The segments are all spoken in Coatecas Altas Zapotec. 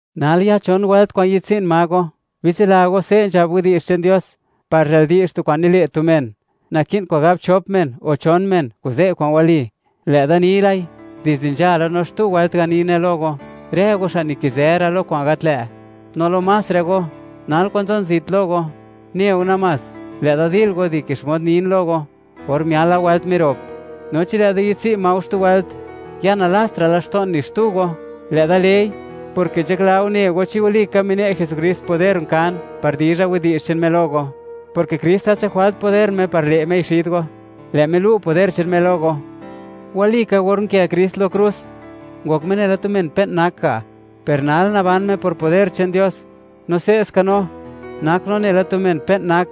Nal ya chon wëlt kwa'n yi'dtswi'n ma go. Bitsila go, se' nzhab widi'zh che'n Dios: “Par zhë'l di'zh tu kwa'n nile' tu men, naki'n kwa'n gab chop men o chon men: Kuze' kwa'n wali.” Lë'da ni lai, dizde nzhala, no xtu wëlt ganine lo go: Rë go xa' nikizë ra' lo kwa'n gat lë', no lo más rë go, nal kwa'n nzon zit lo go, ne go namás, lë' da dil go dike xmod nin lo go, or miala wëlt mirop, no chi lë'da yi'dtswi' ma go xtu wëlt, ya nalastra' laxto'n ni xtu go. Lë'da lei, porke nzhakla go, ne go chi walika mine' Jesukrist poder nkan par dizha widi'zh che'n Me lo go, porke Krist gat nzhak jwalta' poder Me par le' Mei xid go; lë' Me lu' poder che'n Me lo go. Walika or nkë Krist lo krus, ngok Me nela tu men pe'n nak ga'; per nal naban Me por poder che'n Dios. No se'ska no, nak no nela tu men pe'n nak;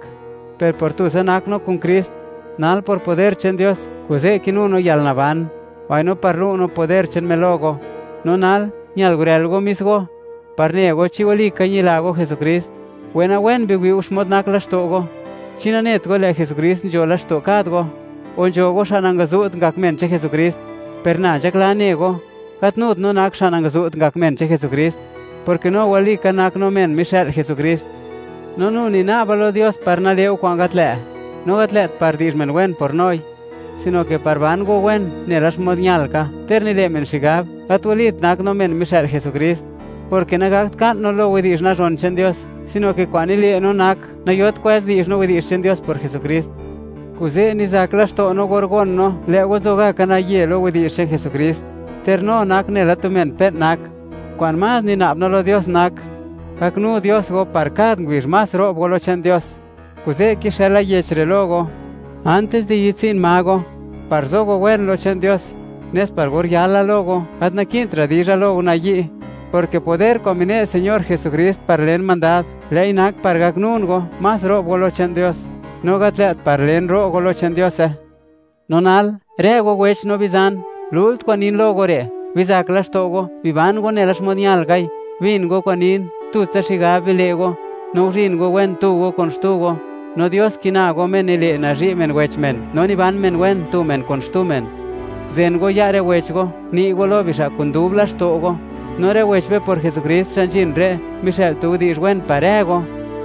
per por tutsa nak no kun Krist, nal, por poder che'n Dios, kuze' kinu no yalnaban, mbaino par lu' no poder che'n Me lo go. No nal, ñal gurël go mis go, par ne go, chi walika ñila go Jesukrist. Wenawen biwi' go, xmod nak laxto' go. ¿Chi nanet go, lë' Jesukrist nzho laxto' kad go? O nzho go, xa' nangazu't ngak men che'n Jesukrist. Per na nzhaklan ne go, gat nut no nak xa' nangazu't ngak men che'n Jesukrist, porke no walika nak no men mixë'l Jesukrist. No nu nina'ba lo Dios par nale' go kwa'n gat lë', no gat lë't par di'zh men wen por noi, sino ke par ban go wen, nela xmod ñal ka, ter nile' men xigab, gat walit, nak no men mixë'l Jesukrist, porke nagakt ka'n no lo widi'zh nazhon che'n Dios, sino ke kwa'n nile' no nak, nayot kwëz di'zh no widi'zh che'n Dios por Jesukrist. Kuze' nizak laxto' no or gon no, lë' go nzoka naye lo widi'zh che'n Jesukrist, ter no nak nela tu men pe'n nak. Kwa'n más nina'b no lo Dios nak, gaknu Dios go par kad ngubizh, más ro'b go lo che'n Dios. Kuze' kixëla yech re' lo go, antis di yi'dtsi'n ma go, par zo go wen lo che'n Dios, nes par or yala lo go, gat naki'ntra' dizha lo go nayi', porke poder kwa'n mine' Señor Jesukrist par len mandad, lë'i nak par gaknun go, más ro'b go lo che'n Dios, no gat lë't par len, ro' go lo che'n Diose. No nal, rë go wech no bizan, lult kwa'n nin lo go re': Bizak laxto' go, biban go nela xmod ñalkai, bin go kwa'n nin, tutsa xigab bile' go, no guzhin go wen tu go kun xtu go, no Dios kina go, Me nile', nazhi' men wech men, no niban men wen, tu men kun xtu men. Guzen go ya' rë wech go, uni' go lo bixa' kun dub laxto' go, no rë wech be por Jesukrist xa' nzhin re', mixë'l tu widi'zh wen par rë go.